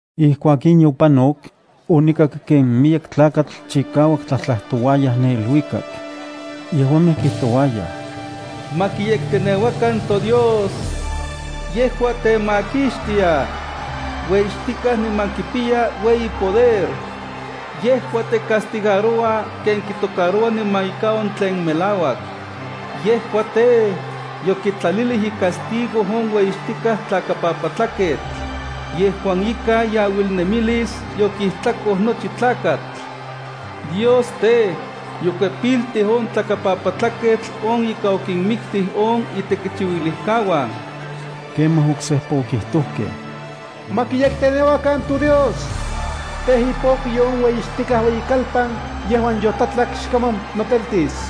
Ijkuak in yopanok, onikak ken miyek tlakatl chikauak tlajtlajtouaya ne iluikak. Yejuamej kijtouayaj: “¡Ma kiyekteneuakan toDios! Yejua temakixtia. Ueyixtikaj niman kipiya ueyi poder. Yejua tecastigaroua ken kitocaroua niman ika on tlen melauak. Yejua tej, yokitlalilij icastigo on ueyixtikaj tlakapapatlaketl, yejuan ikan iauilnemilis yokijtlakoj nochi tlakatl. Dios tej, yokuepiltij on tlakapapatlaketl on ika okinmiktij on itekichiuilijkauan.” Kemaj oksejpa okijtojkej: ¡Ma kiyekteneuakan toDios! Tej, ipokyo on ueyixtikaj ueyikalpan yejuan yotlatlak xkaman noteltis.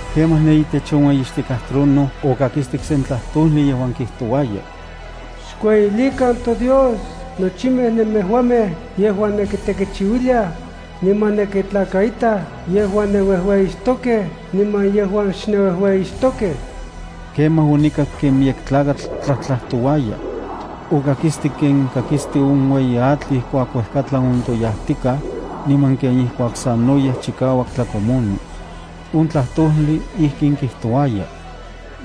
Kemaj ne itech on ueyixtikaj trono okakistik sen tlajtojli yejuan kijtouaya: “Xkueyilikan toDios nochimej nemejuamej yejuan nenkitekichiuiliaj, niman nenkitlakaitaj yejuan nenuejueyixtokej niman yejuan xnenuejueyixtokej.” Kemaj onikak ken miyek tlakatl tlajtlajtouaya. Okakistik ken kakisti on ueyi atl ijkuak uejkatlan ontoyajtikaj, niman ken ijkuak sanoyej chikauak tlakomoni. On tlajtojli ijkin kijtouaya: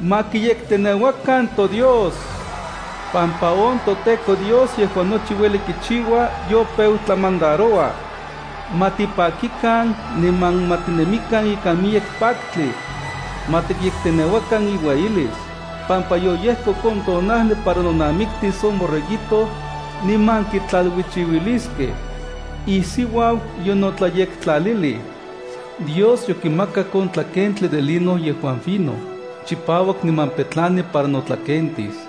“¡Ma kiyekteneuakan toDios!, pampa on toTEKO Dios yejuan nochi ueli kichiua yopeu tlamandaroua. Ma tipakikan, niman ma titemikan ikan miyek paktli. Ma tikyekteneuakan iueyilis, pampa yoyejkok on tonajli para nonamiktis on Borreguito niman kitlaluichiuiliskej. Isiuau yonotlayektlalilij. Dios yokimakak on tlakentli de lino yejuan fino, chipauak niman petlani para notlakentis.”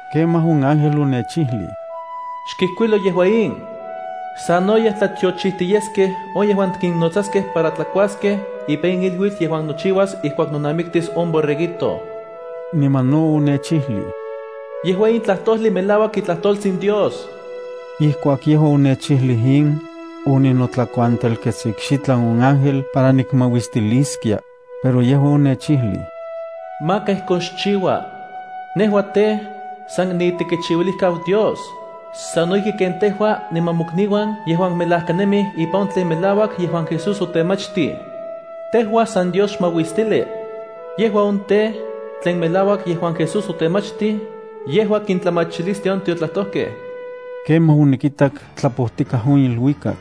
Kemaj on ángel onechijlij: “Xkijkuilo yejua in: ‘Sanoyej tlatiochijti yeskej on yejuan kinnotsaskej para tlakuaskej ipan on iluitl yejuan nochiuas ijkuak nonamiktis on Borreguito.’” Niman no onechijlij: “Yejua in tlajtojli melauak itlajtoltsin Dios.” Ijkuak yejua onechijlij in, oninotlakuantelkets ikxitlan on ángel para nikmauistiliskia, pero yejua onechijlij: “Maka ijkon xchiua. Nejua tej, san niitekichiuilijkau Dios, sano ijki ken tejua niman mokniuan yejuan melajkanemij ipan on tlen melauak yejuan Jesús otemachtij. Tejua san Dios xmauistili.” Yejua on tej, tlen melauak yejuan Jesús otemachtij, yejua kintlamachilistia on tiotlajtojkej. Kemaj onikitak tlapojtikaj on iluikak.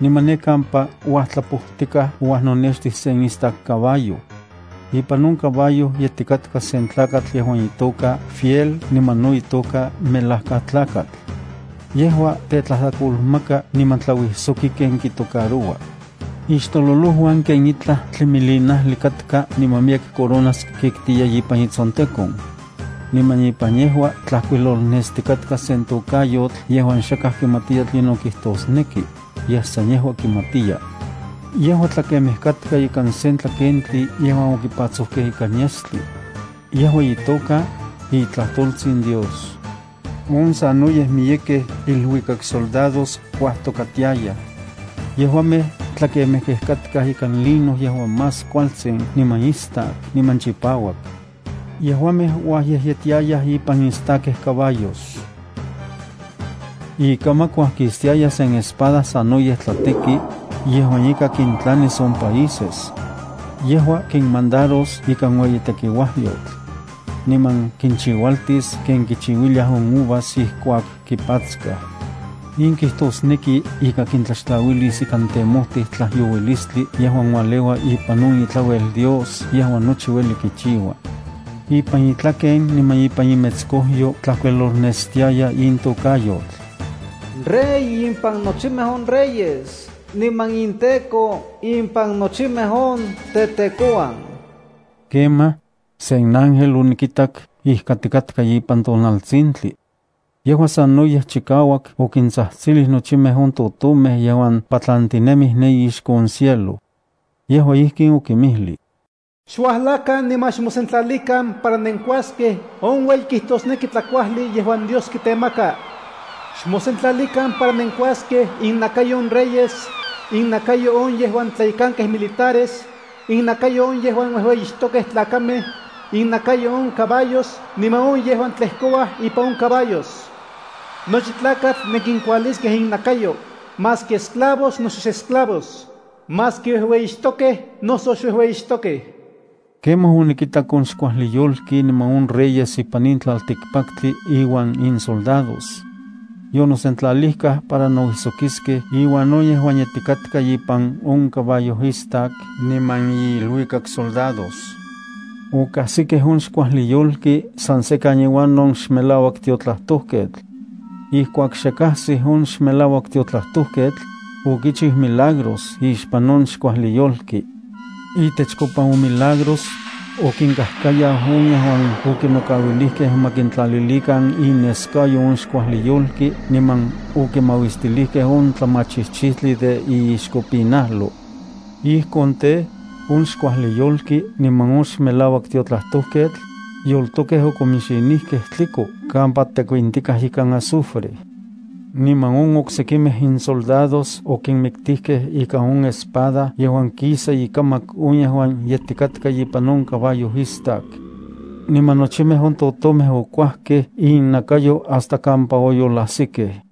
Niman ne kampa uajtlapojtikaj ouajnonextij sen istak caballo. Ipan on caballo yetikatka sen tlakatl yejuan itoka Fiel niman no itoka Melajkatlakatl. Yejua tetlajtlakolmaka niman tlauijsoki ken kitocaroua. Ixtololojuan ken itlaj tlimilinajli katka niman miyek coronas kitkiya ipan itsontekon. Niman ipan yejua tlajkuilolnestikatka sen tokayotl yejuan xakaj kimatiya tlinon kijtosneki, yej san yejua kimatiya. Yejua tlakemej katka ikan sen tlakentli yejuan okipatsojkej ikan yestli. Yejua itoka: iTlajtoltsin Dios. On sanoyej miyekej iluikaksoldados, kuajtokatiayaj. Yejuamej tlakemejkej katkaj ikan lino yejuan más kualtsin niman istak niman chipauak. Yejuamej uajyejyetiayaj ipan istakej caballos. Ikamak uajkistiaya sen espada sanoyej tlateki, yejuan ika kintlanis on países. Yejua kinmandaros ikan ueyi tekiuajyotl. Niman kinchiualtis ken kichiuiliaj on uvas ijkuak kipatskaj. In kijtosneki ika kintlaxtlauilis ikan temojtij tlajyouilisltli yejuan ualeua ipan on itlauel Dios yejuan nochi ueli kichiua. Ipan itlaken niman ipan imetskojyo tlajkuilolnestiaya in tokayotl: “Rey impan nochimej on reyes niman inTEKO impan nochimej on tetekouan.” Kemaj, sen ángel onikitak ijkatikatka ipan tonaltsintli. Yejua sanoyej chikauak okintsajtsilij nochimej on totomej yejuan patlantinemij ne ixko on cielo. Yejua ijkin okinmijlij: “Xuajlakan niman xmosentlalikan para nenkuaskej on ueyi kijtosneki tlakuajli yejuan Dios kitemaka. Xmosentlalikan para nenkuaskej innakayo on reyes, innakayo on yejuan tlayekankej militares, innakayo on yejuan uejueyixtokej tlakamej, innakayo on caballos niman on yejuan tlejkouaj ipan on caballos. Nochi tlakatl nenkinkualiskej innakayo, maski esclavos noso xesclavos, maski uejueyixtokej noso xuejueyixtokej.” Kemaj, onikitak on xkuajli yolki niman on reyes ipan in tlaltikpaktli iuan insoldados. Yonosentlalijkaj para nouijsokiskej iuan on yejuan yetikatka ipan on caballo istak niman iiluikaksoldados. Okajsikej on xkuajli yolki san sekan iuan on xmelauak tiotlajtojketl. Ijkuak xe kajsij on xmelauak tiotlajtolketl, okichiu milagros ixpan on xkuajli yolki. Itechkopa on milagros, okinkajkayau on yejuan okinokauilijkej ma kintlalilikan ineskayo on xkuajli yolki niman okimauistilijkej on tlamachijchijtli de iixkopinajlo. Ijkon tej, on xkuajli yolki niman on xmelauak tiotlajtojketl yoltokej okominxinijkej tliko kampa tekuintikaj ikan azufre. Niman on oksekimej insoldados okinmiktijkej ika on espada yejuan kisa ikamak on yejuan yetikatka ipan on caballo istak. Niman nochimej on totomej okuajkej innakayo hasta kampa oyolajsikej.